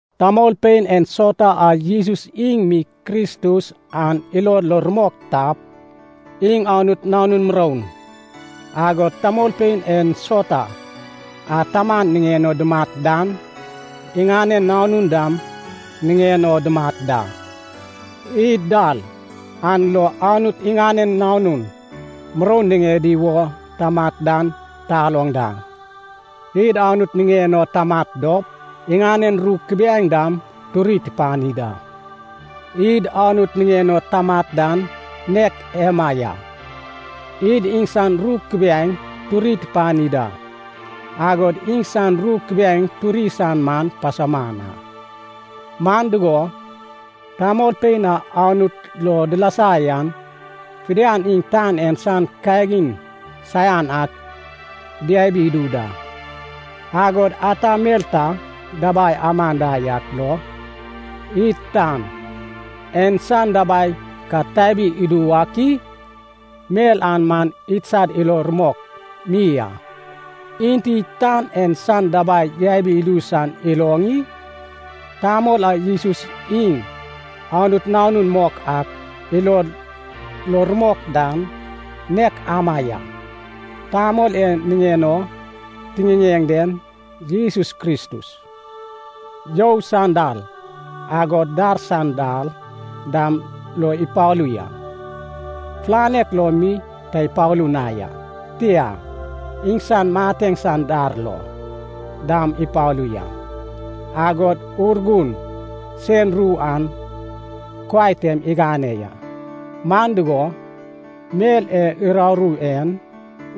Tamolpein ensauta a Jesus iŋ mi Kristus an ilod lo rumok tap, iŋ Anut nanun muroun. Agod tamolpein ensauta a taman niŋen o dumat dan, iŋanen nanun dam niŋen o dumat da. Id dal an lo Anut iŋanen nanun muroun niŋedi wo tamat dan taloŋ da, id Anut niŋen o tamat dop iŋanen ru kubiaeŋ dam turi tupani da. Id Anut niŋen o tamat dan nek ema ya, id iŋsan ru kubiaeŋ turi tupani da. Agod iŋsan ru kubiaeŋ turi san man pasauman a. Man dugo, tamolpein a Anut lo dilasa yan fidian iŋ tan en san kagin saian ak diabi idu da. Agod ata mel ta dabai aman da yak lo id tan en san dabai ka tabi idu wak i? Mel an man idsad ilo rumok mi a. Enti tan en san dabai yabi idu san iloŋ i? Tamol a Jesus iŋ Anut Nanun mok ak ilod lo rumok dan, nek ama ya. Tamol e niŋen o tiŋiŋeŋ den, Jesus Kristus, you san dal, agod dar san dal dam lo ipalu ya. Fulanek lo mi ta ipalu na ya, tia, iŋsan mateŋ san dar lo dam ipalu ya. Agod Urgun sen ru an kuai tem igane ya. Man dugo, mel e uraru en,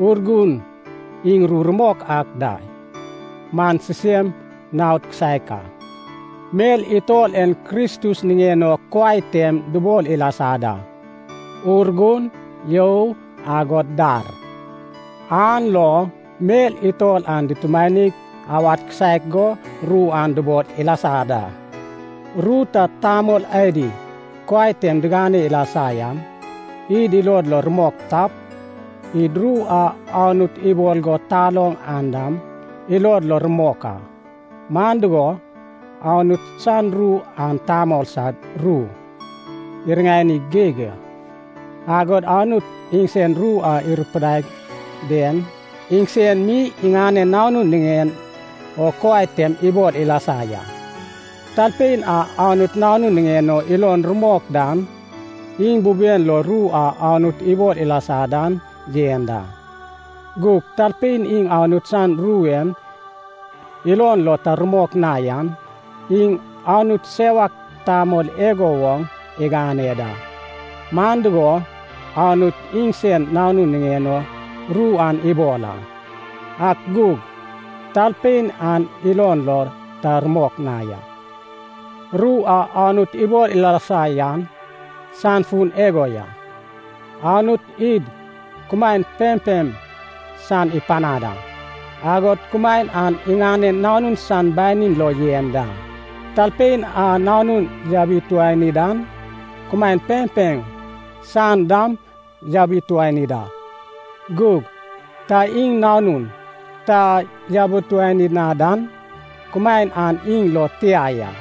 Urgun iŋ ru rumok ak da, man sisem naod kisaek a. Mel utol en Kristus niŋen o kuai tem dubol ilasa da: Urgun, you, agod dar. An lo mel utol an dutumanig awad kisaek go ru an dubol ilasa da. Ru ta tamol adi kuai tem digane ilasa yan id ilod lo rumok tap, id ru a Anut ibol go taloŋ an dam ilod lo rumok a. Man dugo, Anut san ru an tamol sad ru iriŋani geig a. Agod Anut iŋsen ru e irupaiad den, iŋsen mi iŋanen Nanun niŋen o kuai tem ibol ilasa ya. Talpein a Anut Nanun niŋen o ilon rumok dan, iŋ buben lo ru a Anut ibol ilasa dan yen da. Gug talpein iŋ Anut san ru an ilon lo ta rumok na yan, iŋ Anut sewak tamol igo woŋ igane da. Man dugo, Anut iŋsen Nanun niŋen o ru an ibol a, ak gug talpein an ilon lo ta rumok na ya. Ru a Anut ibol ilasa yan san fun igo ya. Anut id kumaen pempem san ipanad a. Agod kumaen an iŋanen Nanun san banin lo yen da. Talpein a Nanun yabituani dan, kumaen pempem san dam yabituani da. Gug ta iŋ Nanun ta yabituani na dan, kumaen an iŋ lo tia ya.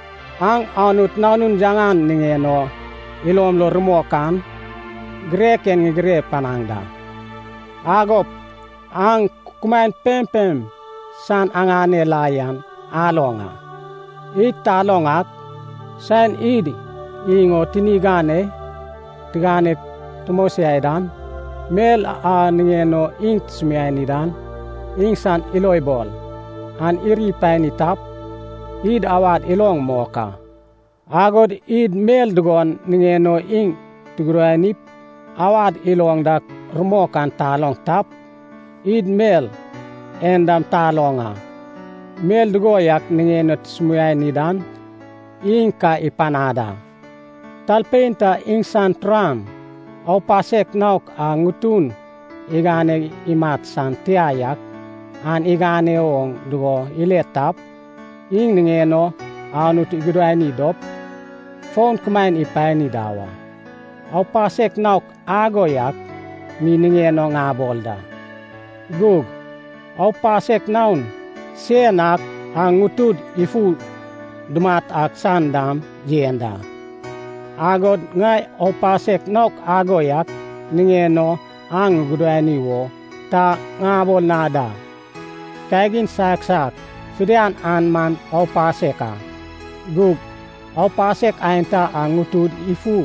Aŋ Anut Nanun yaŋan niŋen o ilom lo rumok an, girek en ŋigire panaŋ da. Agop aŋ kumaen pempem san aŋane la yan aloŋ a. Id taloŋ ak, saen id iŋ o tini ganei tiganeg tumosiai dan, mel a niŋen o iŋ tusumiani dan iŋsan ilobol an iri pani tap, id awad iloŋ mok a. Agod id mel dugon niŋen o iŋ tugudanip awad iloŋ dak rumok an taloŋ tap, id mel en dam taloŋ a, mel dugo yak niŋen o tusumiani dan iŋ ka ipanad a. Talpein ta iŋsan turan aupasek naok a ŋutun igane imat san tia yak an igane oŋ dugo ile tap, iŋ niŋen o Anut igudani dop, fon kumaen ipani da wa. Aupasek naok ago yak mi niŋen o ŋabol da. Gug aupasek naon sen ak a ŋutud ifu dumat ak san dam yen da. Agod ŋai aupasek naok ago yak niŋen o aŋ agudani wo ta ŋabol na da. Kagin saiak saiak fidian an man aupasek a. Gug aupasek aenta a ŋutud ifu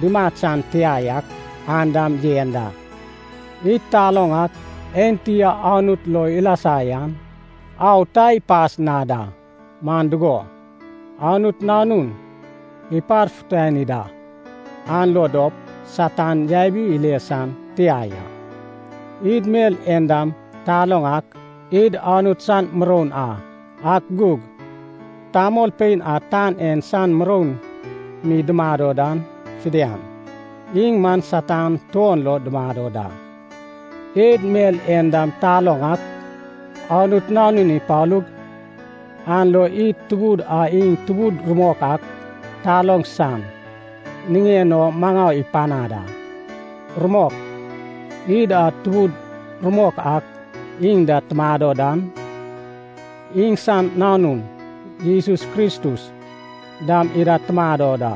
dumat san tia yak an dam yen da. Id taloŋ ak enti a Anut lo ilasa yan au ta ipas na da. Man dugo, Anut Nanun iparfutani da, an lo dop Satan yabi ile san tia ya. Id mel en dam taloŋ ak id Anut san muroun a, ak gug tamolpein a tan en san muroun mi dumado dan fidian, iŋ man Satan tuon lo dumado da. Id mel en dam taloŋ ak, Anut Nanun ipalug, an lo id Tubud a iŋ Tubud rumok ak taloŋ san niŋen o maŋau ipanad a. Rumok, id a Tubud rumok ak iŋ da tumado dan, iŋsan Nanun Jesus Kristus dam ida tumado da.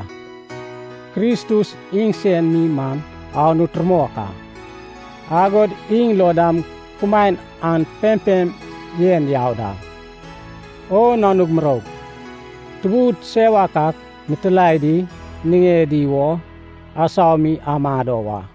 Kristus iŋsen mi man Anut rumok ak, agod iŋ lo dam kumaen an pempem yen yau da. O nanug muroug, tubud sewak ak mitilaedi niŋedi wo asau mi amado wa.